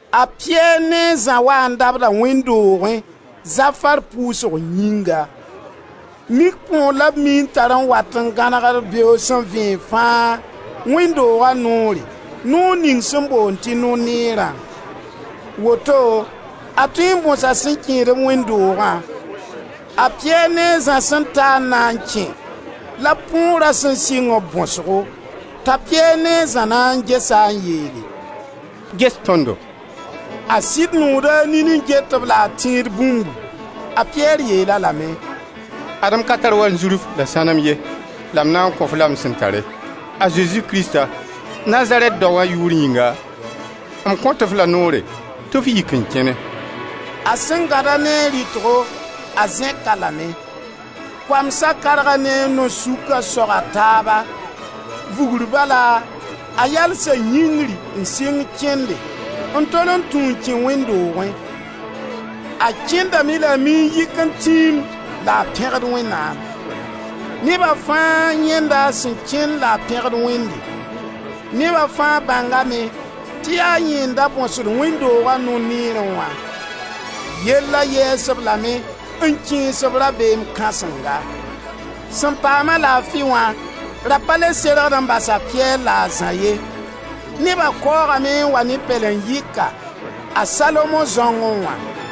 A Piyɛr ne a Zã waa n dabda wẽnd doogẽ zafar pʋʋsg yĩnga. Mik põor la b mii n tar n wat n gãnegd beoog sẽn vẽeg fãa wẽnd dooga noorẽ, noor ning sẽn boond tɩ No-neerã. Woto a tõe n bõsa sẽn kẽed-b wẽnd doogã. A Piyɛr ne a Zã sẽn ta n na n kẽ la põora sẽn sɩng-b bõsgo. T'a Piyɛr ne a Zã na n ges-a n yeele: «Ges tõndo.» A sɩd nooda a nin n get-b la a tẽed bũmbu. A Piyɛr yeel-a lame: «Ad-m ka tar wanzurf la sãnem ye, la m na n kõ-f-la m sẽn tare: a Zezi Krista, Nazarɛt daoã yʋʋr yĩnga, m kõt-f la noore tɩ f yik n kẽne.» A sẽn gãd-a ne a rɩtgo, a zẽk-a lame. Koamsa karga ne a nao-sũkã soga taaba. Vugr bala a yalsa yĩngri n sɩng kẽnde, n tol n tũ n kẽ wẽnd doogẽ. A Kẽndame la a mii n yɩk n tiimde la a pẽgd Wẽnnaam. Neba fãa yãenda a sẽn kẽnd la a pẽgd Wẽnde. Neba fãa bãngame tɩ yaa yẽ n da bõsd wẽnd dooga No-neerẽ wã. Yella yɛɛs-b lame n kẽes-b rabeem kãsenga. Sẽn paam-a laafi wã ra pa le sergd n basa Piyɛr la a Zã ye. Neba kaoogame n waa ne pɛlen-yɩka, a Salomon zãongẽ wã.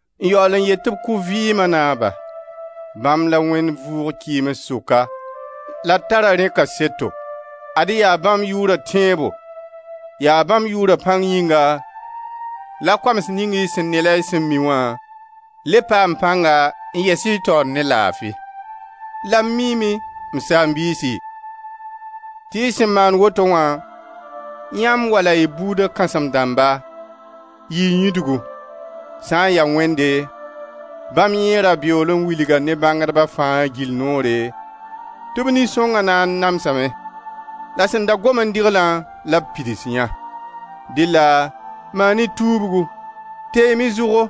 N yaool n yet tɩ b kʋ Vɩɩma Naaba. Bãmb la Wẽnd vʋʋg kɩɩms sʋka la d tara rẽ kaseto. Ad-y yaa bãmb yʋʋra tẽebo, yaa bãmb yʋʋra pãng yĩnga la koams ning y sẽn ne la y sẽn mi wã, le paam pãnga n yɛs y taoor ne laafi. La m miime, m saam-biisi, tɩ y sẽn maan woto wã, yãmb wala y buuda kãsem-dãmba, yɩɩ yĩdgu. Sã n ya Wẽnde, bãmb yẽ ra beool n wilga ne bãngdba fãa gill noore tɩ b Nin-sõnga na n namsame. La sẽn da gom n dɩgla la b pids yã. Dɩlla maan-y tuubgu, teem-y zʋgo,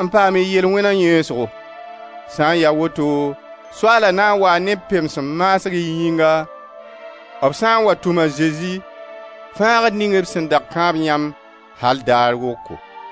n paam y yel-wẽna yẽesgo. Sã n ya woto Soaala na n waa ne pems maasg y yĩnga b sã n wa tʋm a Zezi, Fãagd ning b sẽn da kãab yãmb al daar woko.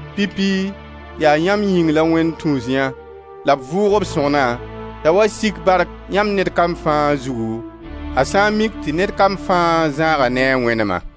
Pipi yaa yãmb yĩng la Wẽnd tũus yã la b vʋʋg b Sõgna t'a wa sik bark yãmb ned kam fãa zugu a sã n mik tɩ ned kam fãa zãaga ne a wẽnema.»